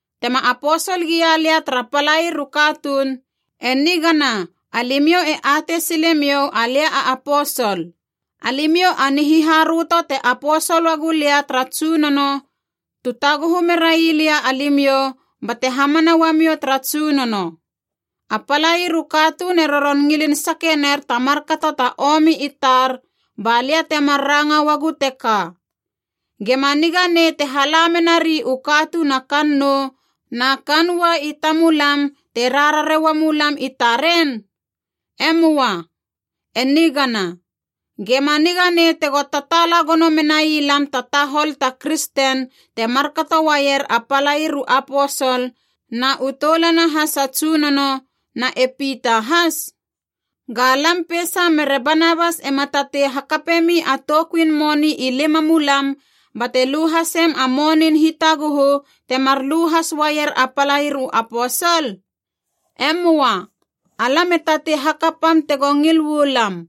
Tema aposol gia lia tara palair u katuun, e nigana alimiou e atei silemiou alia a aposol. Alimiou a nihiharöto te aposol uagulia tara Tsunono, tu taguhu merai lia alimiou bate hamana uamiou tara Tsunono. A palair u katuun e roron ngilin sake ner ta markato ta omi i tar, ba lia temar ranga uagu teka: gema niga nei te hala merari u katuun a kannou na kaan ua i tamulam te rarare uamulam i taren? E möa, e nigana. Ge ma niga nei tego tataala gono menai lam ta tahol ta kristen te markato uaier a palair u aposol na u toulana has a Tsunono, na e Pita has? Ga lam peisa mere Banabas ema tatei hakapemi a toukuin moni i limamulam bate lu hasem a monin hitaguhu temar lu has uaier a palair u aposol? E möa, alam e tatei hakapam tego ngil uu lam.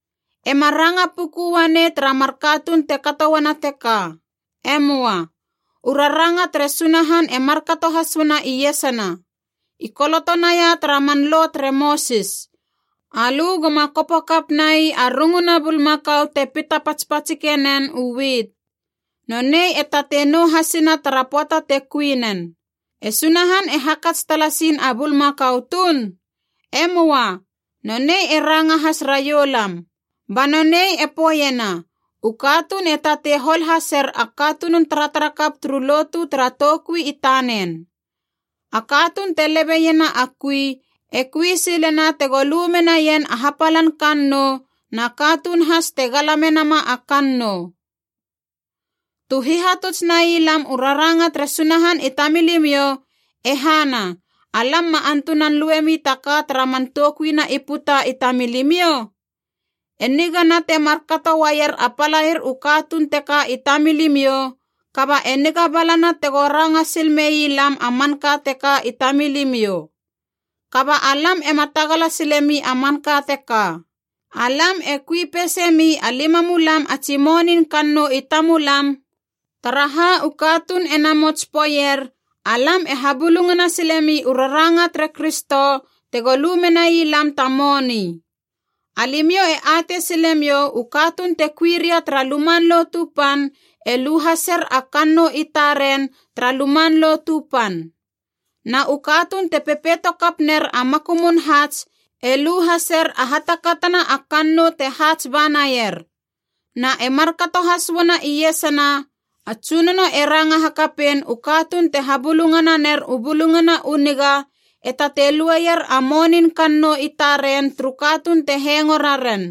E ma ranga puku uanei tara mar katuun te kato uana teka. E möa. U raranga tere Sunahan e markato has uana iesana. I koloto naia tara man Lo tere Mosis, “Alö goma kopo kapnai a runguna bulmakau te pita patspatsike nen u wit. Nonei e tatei nou hasina tara pöata te kui nen.” E Sunahan e hakats talasin a bulmakau tuun? E möa. Nonei e ranga has raioulam. Ba nonei e poeiena u katuun e tatei hol haser a katunun taratarakap turu lotu tara toukui i tanen. A katuun te lebe iena a kui e kui silena tego lu menaien a hapalan kannou, na katuun has te gala menama a kannou. Tu hihatuts nai lam u raranga tere Sunahan i tamilimiou, e hana, alam ma antunan luemi ta ka tara man toukuina i puta i tamilimiou? E nigana te mar kato uaier a palair u katuun teka i tamilimiou, kaba e niga balana tego ranga sil mei lam a manka teka i tamilimiou. Kaba alam ema tagala silemi a manka teka. Alam e kui peise mi a limamulam a tsi monin kannou i tamulam, taraha u katuun e namots poeier alam e habulungana silemi u raranga tere Kristo tego lu menai lam ta moni. Alimiou e atei silemiou u katuun te kui ria tara Luman Lotu Pan e lu haser a kannou i taren tara Luman Lotu Pan. Na u katuun te pepeito kap ner a makumun haats e lu haser a hatakatana a kannou te haats ba naier. Na e markato has uana iesana, a Tsunono e ranga hakapein u katuun te habulungananer u Bulungana u Niga e tatei lueier a monin kannou i taren turu katuun te hengo raren.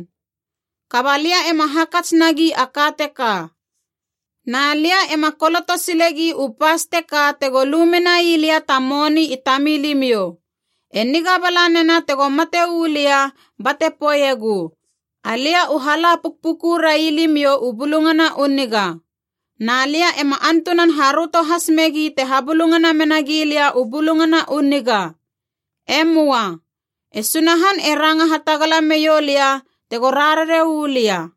Kaba lia ema hakats nagi a ka teka. Na lia ema koloto silegi u pas teka tego lu menai lia ta moni i tamilimiou. E niga bala nena tego mate uu lia bate poeiegu, alia u hala pukpuku railimiou u Bulungana u Niga. Na lia ema antunan haröto has megi te habulungana mena gilia u Bulungana u Niga. E möa. E Sunahan e ranga hatagala meiou lia tego rarare u lia.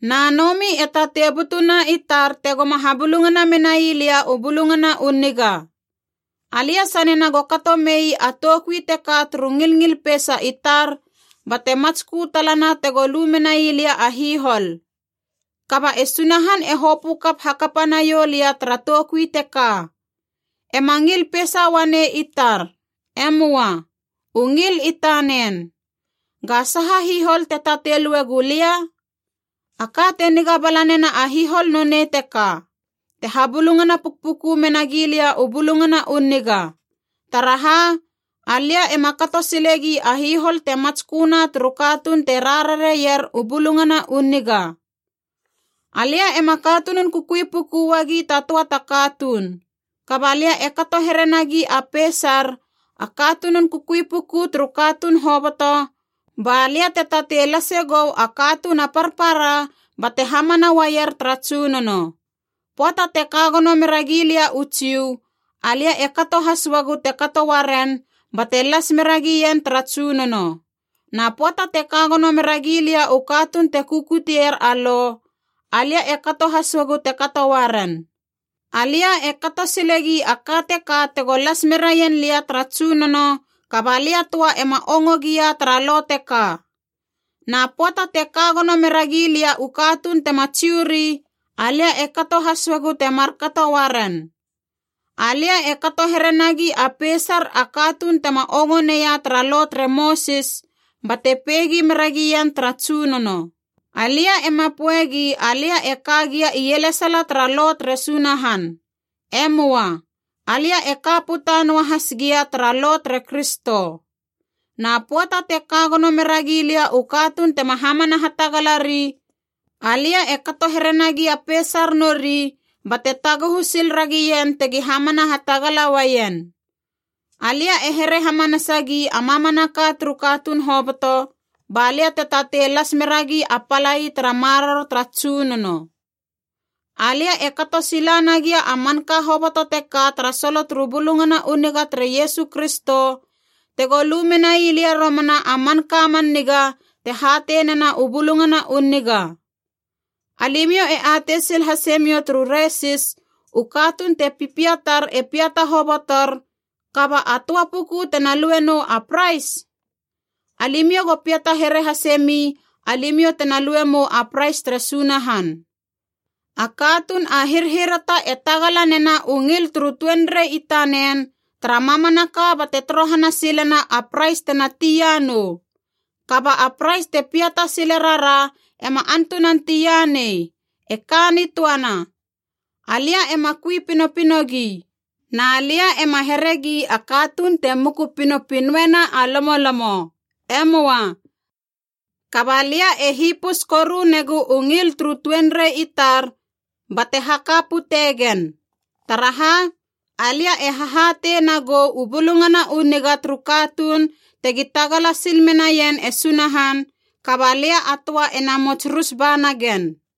Na nomi e tatei butuna i tar tegoma habulungana menai lia u Bulungana u Niga. Alia sanena go kato mei a toukui teka turu ngilngil peisa i tar, bate matskö talana tego lu menai lia a hihol. Kaba e Sunahan e hopö kap hakapa naiou lia tara toukui teka. E ma ngil peisa uanei i tar. E möa. U ngil i tanen. Ga saha hihol te tatei lue gulia? A ka te niga bala nena a hihol nonei teka: te habulungana pukpuku mena gilia u Bulungana u Niga. Taraha, alia ema kato silegi a hihol te matsköna turu katuun te rarareier u Bulungana u Niga. Alia ema katunun kukui puku uagi ta töa ta katuun. Kaba lia e kato here nagi a peisar a katunun kukui puku turu katuun hoboto ba lia te tatei lase gou a katuun a parpara bate hamana uaier tara Tsunono. Pöata te ka gono mera gia lia u Jiu, alia e kato has uagu te kato uaren bate las mera gien tara Tsunono. Na pöata te ka gono mera gia lia u katuun te kukutier a Lo, alia e kato has uagu te kato uaren. Alia e kato silegi a ka teka tego las meraien lia tara Tsunono, kaba lia töa ema ongo gia tara Lo teka. Na pöata te ka gono mera gia lia u katuun tema Jiu ri, alia e kato has uagu te markato uaren. Alia e kato here nagi a peisar a katuun tema ongo neia tara Lo tere Mosis, bate peigi mera gien tara Tsunono. Alia ema poegi alia e ka gia ielesala tara Lo tere Sunahan. E möa. Alia e ka puta noahas gia tara Lo tere Kristo. Na pöata te ka gono meragi lia u katuun tema hamana hatagalari, alia e kato here nagi a peisar nori, bate taguhu sil ragien tegi hamana hatagala uaien. Alia e here hamanasagi a mamanaka turu katuun hoboto, ba lia te tatei las meragi a palai tara maroro tara Tsunono. Alia e kato sila nagia a manka hoboto teka tara solo turu Bulungana u Niga tere Iesu Kristo, tego lu menai lia romana a manka man niga te hatei nena u Bulungana u Niga. Alimiou e atei sil hasemiou turu resis u katuun te pipiatar e piata hobotor, kaba a töa puku tena lue nou a prais? Alimiou go piata here hase mi, alimiou tena lue mou a prais tere Sunahan. A katuun a hirhirata e tagala nena u ngil turu tuenrei i tanen tara mamanaka bate torohana silena a prais tena tia nou. Kaba a prais te piata sile rara ema antunan tia nei, e ka nitöana. Alia ema kui pinopinogi. Na lia ema heregi a katuun te muku pinopinoena a lomolomo. E möa. Kaba lia e hipus koru negu u ngil turu tuenrei i tar bate haka pute gen. Taraha, alia e hahatei na gou u Bulungana u Niga turu katuun tegi tagala sil menaien e Sunahan, kaba lia a töa ena mots rus ba nagen.